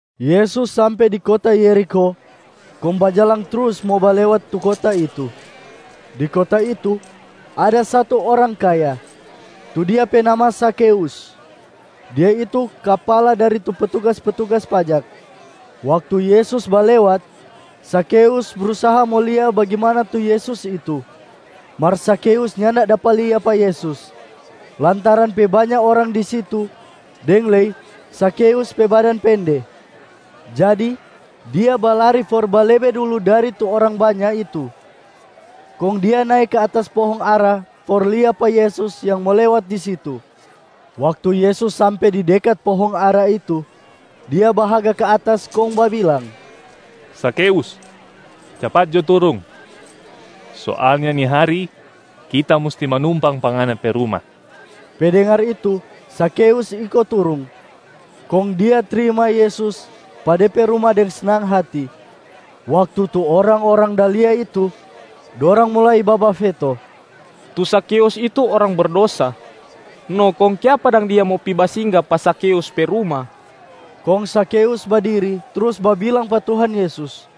Yesus sampe di kota Yerikho kong bajalang trus mo balewat tu kota itu. Di kota itu ada satu orang kaya, tu dia pe nama Zakheus. Dia itu kapala dari tu petugas-petugas pajak. Waktu Yesus balewat, Zakheus brusaha mo lia bagimana tu Yesus itu. Mar Zakheus nyanda dapa lia pa Yesus, lantaran pe banya orang di situ deng lei Zakheus pe badan pende. Jadi dia balari for balebe dulu dari tu orang banya itu, kong dia nae ka atas pohong ara for lia pa Yesus yang mo lewat di situ. Waktu Yesus sampe di dekat pohong ara itu, Dia bahaga ka atas kong babilang, “Zakheus, capat jo turung! Soalnya ni hari Kita musti manumpang pa ngana pe ruma.” Pe dengar itu, Zakheus iko turung, kong dia trima Yesus pa de pe ruma deng snang hati. Waktu tu orang-orang da lia itu, dorang mulai babafeto, “Tu Zakheus itu orang berdosa, no kong kiapa dang Dia mo pi basingga pa Zakheus pe ruma?” Kong Zakheus badiri trus babilang pa Tuhan Yesus,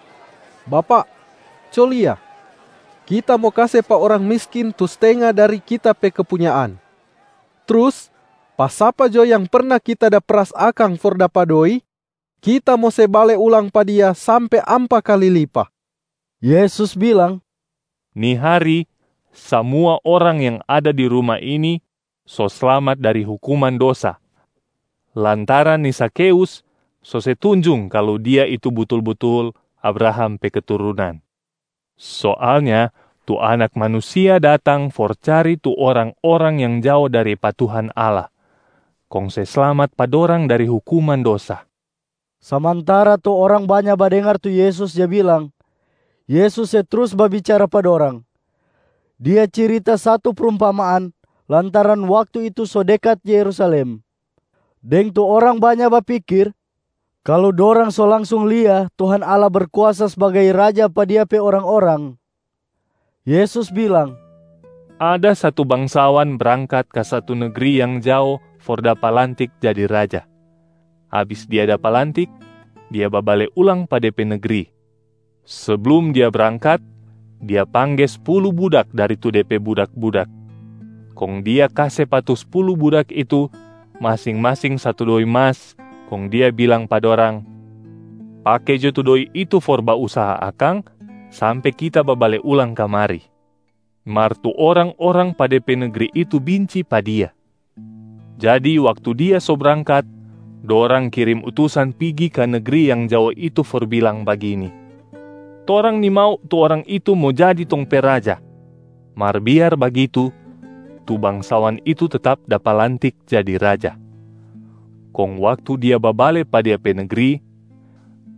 “Bapak, co lia, kita mo kase pa orang miskin tu stenga dari kita pe kepunyaan. Trus pa sapa jo yang perna kita da peras akang for dapa doi, kita mo se bale ulang pa dia sampe ampa kali lipa.” Yesus bilang, “Ni hari, samua orang yang ada di ruma ini so slamat dari hukuman dosa lantaran ni Zakheus so se tunjung kalu dia itu butul-butul Abraham pe keturunan. Soalnya tu Anak Manusia datang for cari tu orang-orang yang jao dari pa Tuhan Allah, kong se slamat pa dorang dari hukuman dosa.” Samantara tu orang banya badengar tu Yesus ja bilang, Yesus se trus babicara pa dorang. Dia cirita satu prumpamaan lantaran waktu itu so dekat Yerusalem, deng tu orang banya bapikir kalu dorang so langsung lia Tuhan Allah Berkuasa sbagai Raja pa Dia pe orang-orang. Yesus bilang, “Ada satu bangsawan brangkat ka satu negri yang jao for dapa lantik jadi raja. Abis dia dapa lantik, dia babale ulang pa de pe negri. Seblum dia brangkat, dia pangge spulu budak dari tu de pe budak-budak. Kong dia kase pa tu spulu budak itu masing-masing satu doi masa kong dia bilang pa dorang, ‘Pake jo tu doi itu for bausaha akang sampe kita babale ulang kamari.’ Mar tu orang-orang pa de pe negri itu binci pa dia. Jadi waktu dia so brangkat, dorang kirim utusan pigi ka negri yang jao itu for bilang bagini, ‘Torang nimau tu orang itu mo jadi tong pe raja.’ Mar biar bagitu tu bangsawan itu tetap dapa lantik jadi raja. Kong waktu dia babale pa dia pe negri,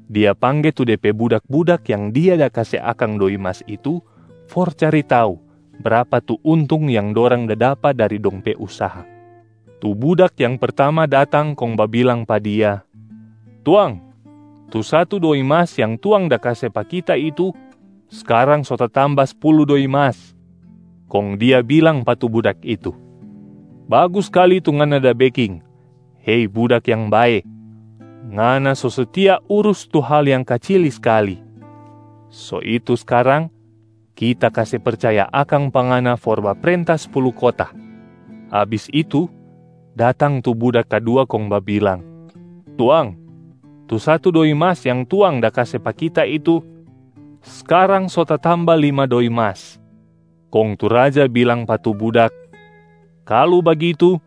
dia pangge tu de pe budak-budak yang dia da kase akang doi mas itu for cari tau brapa tu untung yang dorang da dapa dari dong pe usaha. Tu budak yang pertama datang kong babilang pa dia, ‘Tuang, tu satu doi mas yang tuang da kase pa kita itu, skarang so tatamba spulu doi mas.’ Kong dia bilang pa tu budak itu, ‘Bagus skali tu ngana da beking, hei budak yang bae. Ngana so setia urus tu hal yang kacili skali, so itu skarang kita kase percaya akang pa ngana for baprenta spulu kota.’ Abis itu, datang tu budak kadua kong babilang, ‘Tuang, tu satu doi mas yang tuang da kase pa kita itu, skarang so tatamba lima doi mas.’ Kong tu raja bilang pa tu budak, ‘Kalu bagitu,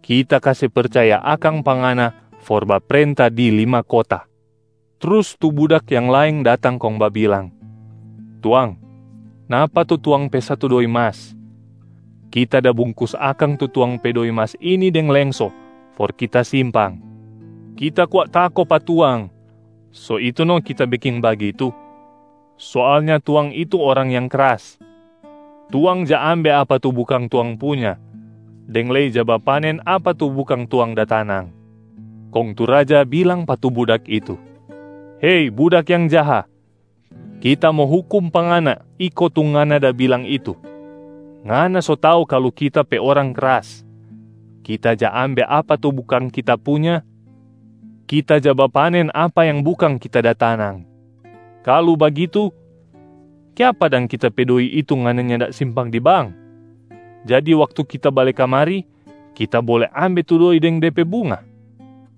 kita kase percaya akang pa ngana for baprenta di lima kota.’ Trus tu budak yang laeng datang kong babilang, ‘Tuang, napa tu tuang pe satu doi mas. Kita da bungkus akang tu tuang pe doi mas ini deng lengso for kita simpang. Kita kwa tako pa tuang, so itu no kita beking bagitu. Soalnya tuang itu orang yang kras, tuang ja ambe apa tu bukang tuang punya deng lei ja bapanen apa tu bukang tuang da tanang.’ Kong tu raja bilang pa tu budak itu, ‘Hei budak yang jaha, kita mo hukum pa ngana iko tu ngana da bilang itu. Ngana so tau kalu kita pe orang kras. Kita ja ambe apa tu bukang kita punya, kita ja bapanen apa yang bukang kita da tanang. Kalu bagitu, kiapa dang kita pe doi itu ngana nyanda simpang di bank? Jadi waktu kita bale kamari, kita bole ambe tu doi deng de pe bunga.’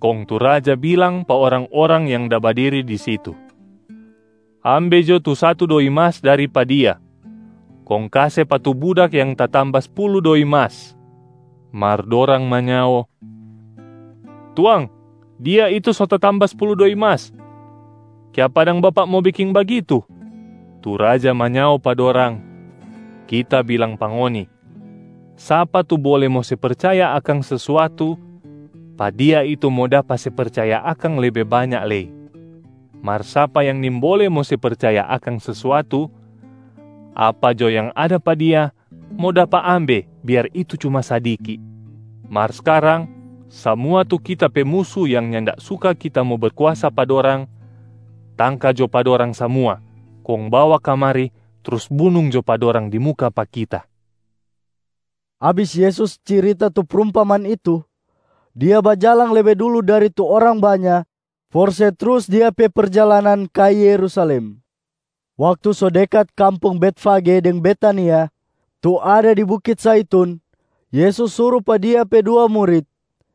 Kong tu raja bilang pa orang-orang yang da badiri di situ, ‘Ambe jo tu satu doi mas dari pa dia, kong kase pa tu budak yang tatamba spulu doi mas.’ Mar dorang manyao, ‘Tuang, dia itu so tatamba spulu doi mas. Kiapa dang bapak mo beking bagitu?’ Tu raja manyao pa dorang, ‘Kita bilang pa ngoni, sapa tu bole mo se percaya akang sesuatu, pa dia itu mo dapa se percaya akang lebe banya lei. Mar sapa yang nimbole mo se percaya akang sesuatu, apa jo yang ada pa dia mo dapa ambe biar itu cuma sadiki. Mar skarang, samua tu kita pe musu yang nyanda suka kita mo berkuasa pa dorang, tangka jo pa dorang samua kong bawa kamari trus bunung jo pa dorang di muka pa kita.’” Abis Yesus cirita tu prumpamaan itu, Dia bajalang lebe dulu dari tu orang banya for se trus Dia pe perjalanan ka Yerusalem. Waktu so dekat kampung Betfage deng Betania, tu ada di bukit Zaitun, Yesus suru pa Dia pe dua murit,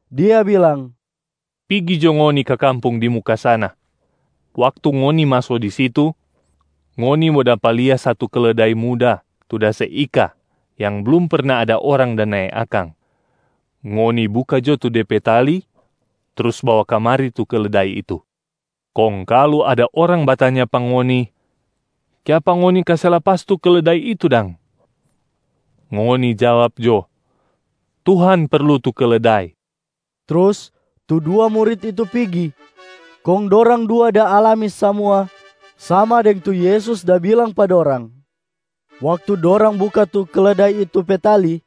Dia bilang, “Pigi jo ngoni ka kampung di muka sana. Waktu ngoni maso di situ, ngoni mo dapa lia satu keledai muda tu da se ika yang blum perna ada orang da nae akang. Ngoni buka jo tu de pe tali trus bawa kamari tu keledai itu. Kong kalu ada orang batanya pa ngoni, ‘Kiapa ngoni kase lapas tu keledai itu dang?’ Ngoni jawab jo, ‘Tuhan perlu tu keledai.’” Trus tu dua murit itu pigi, kong dorang dua da alami samua sama deng tu Yesus da bilang pa dorang. Waktu dorang buka tu keledai itu pe tali,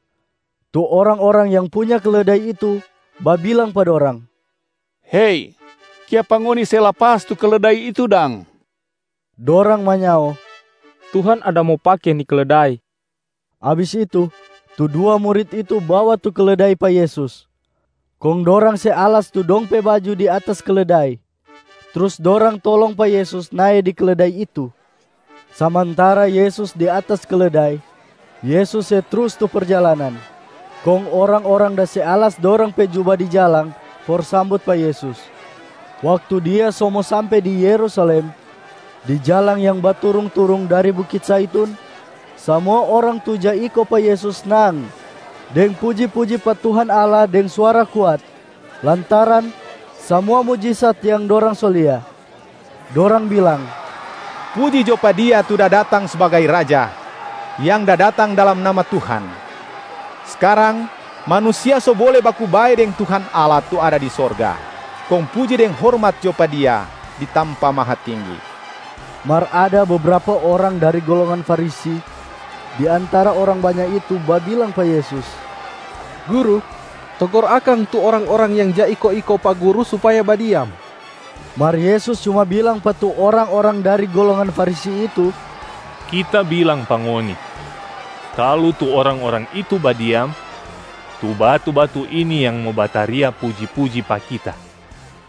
tu orang-orang yang punya keledai itu babilang pa dorang, “Hei, kiapa ngoni se lapas tu keledai itu dang?” Dorang manyao, “Tuhan ada mo pake ni keledai.” Abis itu, tu dua murit itu bawa tu keledai pa Yesus, kong dorang se alas tu dong pe baju di atas keledai, trus dorang tolong pa Yesus nae di keledai itu. Samantara Yesus di atas keledai, Yesus se trus tu perjalanan. Kong orang-orang da se alas dorang pe juba di jalang for sambut pa Yesus. Waktu Dia so mo sampe di Yerusalem, di jalang yang baturung-turung dari Bukit Zaitun, samua orang tu ja iko pa Yesus snang deng puji-puji pa Tuhan Allah deng suara kuat lantaran samua mujisat yang dorang so lia. Dorang bilang, “Puji jo pa Dia tu da datang sbagai Raja, yang da datang dalam nama Tuhan! Skarang manusia so bole baku bae deng Tuhan Allah tu ada di sorga, kong puji deng hormat jo pa Dia di tampa mahatinggi!” Mar ada bebrapa orang dari golongan Farisi di antara orang banya itu babilang pa Yesus, “Guru, togor akang tu orang-orang yang ja iko-iko pa Guru supaya badiam.” Mar Yesus cuma bilang pa tu orang-orang dari golongan Farisi itu, “Kita bilang pa ngoni, kalu tu orang-orang itu badiam, tu batu-batu ini yang mo bataria puji-puji pa Kita.”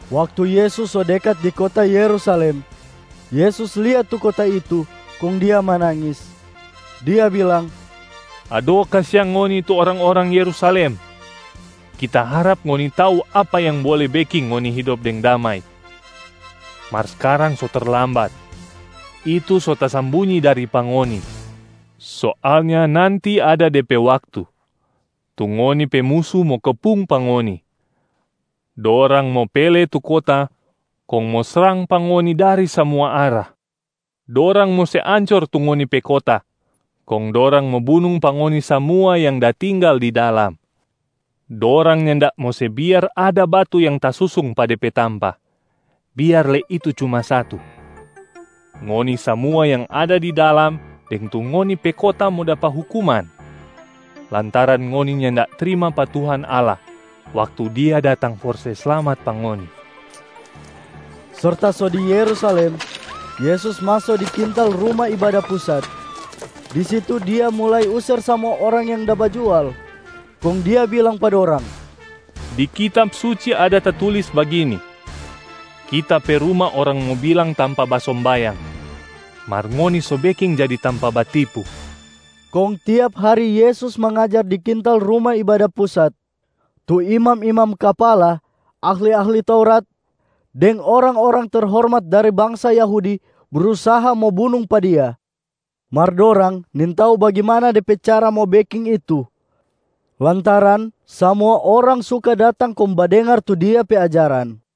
Waktu Yesus so dekat di kota Yerusalem, Yesus lia tu kota itu kong Dia manangis. Dia bilang, “Ado kasiang ngoni tu orang-orang Yerusalem. Kita harap ngoni tau apa yang bole beking ngoni hidop deng damai, mar skarang so terlambat, itu so tasambunyi dari pa ngoni. Soalnya nanti ada de pe waktu, tu ngoni pe musu mo kepung pa ngoni, dorang mo pele tu kota kong mo srang pa ngoni dari samua arah. Dorang mo se ancor tu ngoni pe kota kong dorang mo bunung pa ngoni samua yang da tinggal di dalam. Dorang nyanda mo se biar ada batu yang tasusung pa de pe tampa, biar lei itu cuma satu. Ngoni samua yang ada di dalam deng tu ngoni pe kota mo dapa hukuman, lantaran ngoni nyanda trima pa Tuhan Allah waktu Dia datang for se slamat pa ngoni.” Serta so di Yerusalem, Yesus maso di kintal Ruma Ibada Pusat. Di situ Dia mulai user samua orang yang da bajual. Kong Dia bilang pa dorang, “Di Kitab Suci ada tatulis bagini, ‘Kita pe ruma orang mo bilang tampa basombayang, mar ngoni so beking jadi tampa batipu.’” Kong tiap hari Yesus mangajar di kintal Ruma Ibada Pusat. Tu imam-imam kapala, ahli-ahli Taurat, deng orang-orang terhormat dari bangsa Yahudi brusaha mo bunung pa Dia. Mar dorang nintau bagimana de pe cara mo beking itu lantaran samua orang suka datang kong badengar tu Dia pe ajaran.